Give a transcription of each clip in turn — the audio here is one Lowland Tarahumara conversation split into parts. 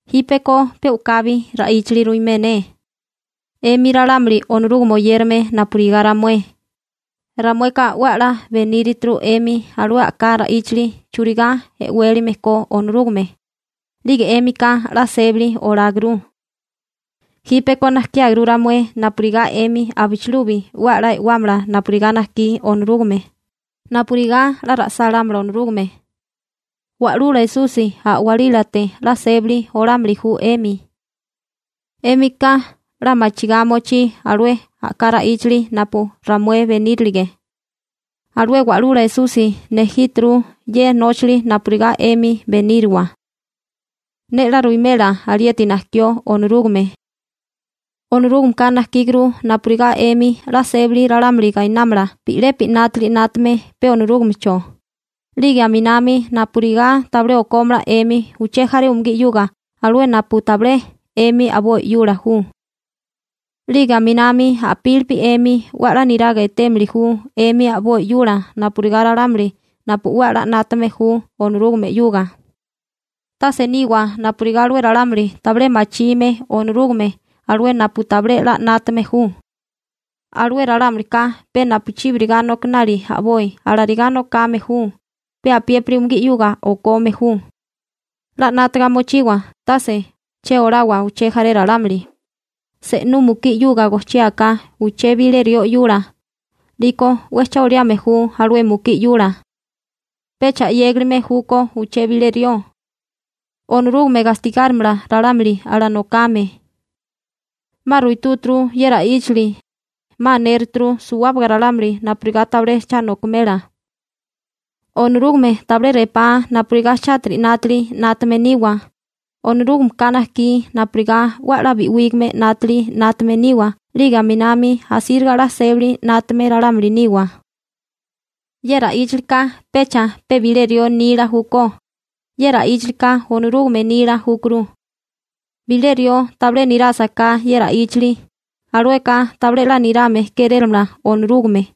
Jípeko pe u'kabi ra'íchali ruimé ne. 'Emi ralámuli Onorúgame oyérame napurigá ramué, ramueka 'we a'lá benírituru 'emi alué a'ká ra'íchali churigá e'wélime ko Onorúgame. 'Lige 'émika 'la sébali oláguru. Jípeko najkiáguru ramué napurigá 'emi abichilubi 'we a'lá e'wámala napurigá najkí Onorúgame, napurigá 'la ra'sálámala Onorúgame. Wa'lula Esusi a'walílate 'la sébali olámili ju 'emi. 'Émika 'la machigá mochí alué a'ká ra'íchali napu ramué benírilige. Alué Wa'lula Esusi nejíturu ye nóchali napurigá 'emi beníriwa. Ne 'la ruwimela alieti najkió Onorúgame. Onorúgameka najkíguru napurigá 'emi 'la sébali ralámuli gainámala bi'lepi 'nátili 'nátame pe Onorúgamecho, 'lige aminami napurigá tabilé okómala 'emi uché jaré umugí 'yuga alué napu tabilé 'emi a'boi 'yula ju. 'Lige aminami a'pílipi 'emi 'we a'lá niraga etémili ju 'emi a'boi 'yula napurigá ralámuli napu 'we a'lá 'nátame ju Onorúgame 'yuga. Tase niwa napurigá alué ralámuli tabilé machime Onorúgame alué napu tabilé 'la 'nátame ju. Alué ralámulika pe napuchíbiriga nokinali a'boi alarigá nokame ju, pe apiépiri umugí 'yuga okome ju. 'La 'nátaga mochiwa tase che olawa uché jaré ralámuli. Se'nú mukí 'yuga gojchiáká uché bilé rió 'yula, 'liko 'we cha oliame ju alué mukí 'yula. Pecha 'yégalime júkó uché bilé rió. Onorúgame gastigárimala ralámuli alanokame. 'Ma ruitúturu ye ra'íchali, 'ma anéruturu suwábaga ralámuli napurigá tabilé cha nokimela. Onorúgame tabilé repá napurigá chátiri 'nátili 'nátame niwa, Onorúgameka najkí napurigá 'we a'lá bi'wígame 'nátili 'nátame niwa 'lige aminami asíriga 'la sébali 'nátame ralámuli niwa. Ye ra'íchalika pecha pe bilé rió nila júkó, ye ra'íchalika Onorúgame nila júkuru. Bilé rió tabilé nirásaká ye ra'íchali, alueka tabilé 'la nirame kérélamala Onorúgame,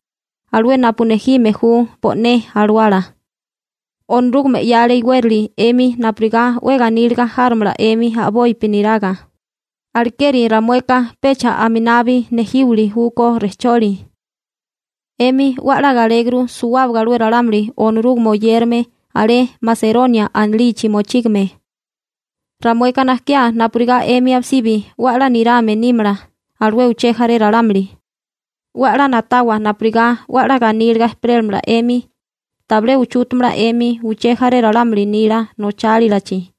alué napu nejime ju bo'né alawala. Onorúgame 'yale iwérali 'emi napurigá 'we ganíliga járomala 'emi a'bopi niraga. Alekeri ramueka pecha aminabi nejíwili júkó rejcholi. 'Emi 'we a'lá galéguru suwábaga alué ralámuli Onorúgame oyérame alé Maseronia anilichi mochígame. Ramueka najkiá napurigá 'emi abisibi 'we a'lá nirame nímala alué uché jaré ralámuli. 'We a'lá na'tawa napurigá 'we a'lá ganíliga ejperéramala 'emi, tabilé uchútamala 'emi uché jaré ralámuli nila nochálilachi.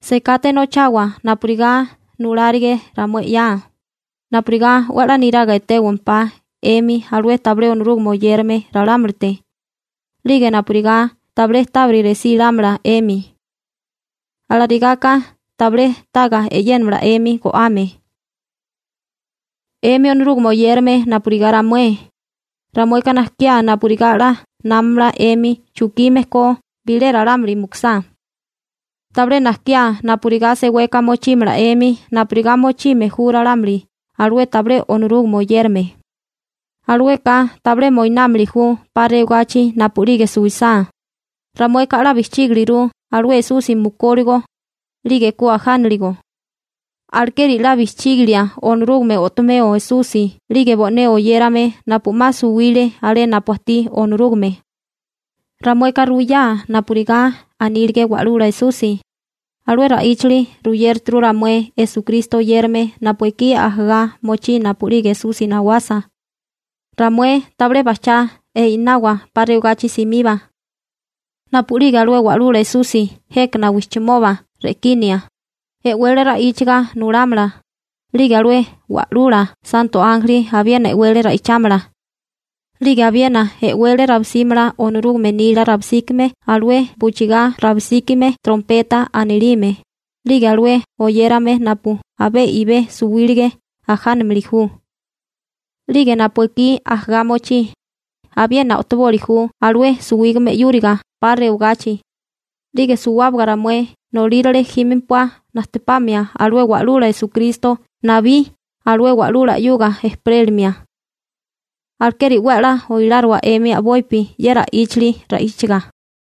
Sekate nochawa napurigá nulálige ramué 'ya, napurigá 'we a'lá niraga etéwampá 'emi alué tabilé Onorúgame oyérame ralámulite, 'lige napurigá tabilé tábiri resí lámala 'emi. Alarigá ka tabilé taga e'yénamala 'emi go'ame. 'Emi Onorúgame oyérame napurigá ramué, ramueka najkiá napurigá 'la námamala 'emi chukime ko bilé ralámuli mukusá. Tabilé najkiá napurigá seweka mochímala 'emi napurigá mochime ju ralámuli alué tabilé Onorúgame oyérame. Alueka tabilé moinámili ju 'pa rewagachi napu'lige suwisá. Ramueka 'la bijchígiliguru alué Esusi mukúligo, 'lige ku ajánaligo. Alekeri 'la bijchígilia Onorúgame o'tomeo Esusi 'lige bo'né oyérame napu 'ma suwile alé napu ajtí Onorúgame. Ramueka ruwiyá napurigá anílige Wa'lula Esusi, alué ra'íchali ruyéruturu ramué Esukristo oyérame napu ekí ajagá mochí napu'lige Esusi nawasa, ramué tabilé bajchá i'nawa 'pa rewagachi simiba. Napu'lige alué Wa'lula Esusi jékana wijchimoba re'kinia, e'wele ra'íchaga nulámala, 'lige alué wa'lula santo ánjeli abiena e'wele ra'ichámala. 'Lige abiena e'wele rabisímala Onorúgame nila rabisíkime alué buchigá rabisíkime («trompeta» anilime), 'lige alué oyérame napu abé i'bé suwílige ajánamili ju. 'Lige napu ekí ajagá mochí, abiena o'tiboli ju alué suwígame 'yúriga 'pa rewagachi, 'lige suwábaga ramué nolírale jímempuá najtepamia alué Wa'lula Esukristo nabí alué wa'lula 'yuga ejperélimia. Alekeri 'we a'lá oiláriwa 'emi a'bopi ye ra'íchali ra'íchaga.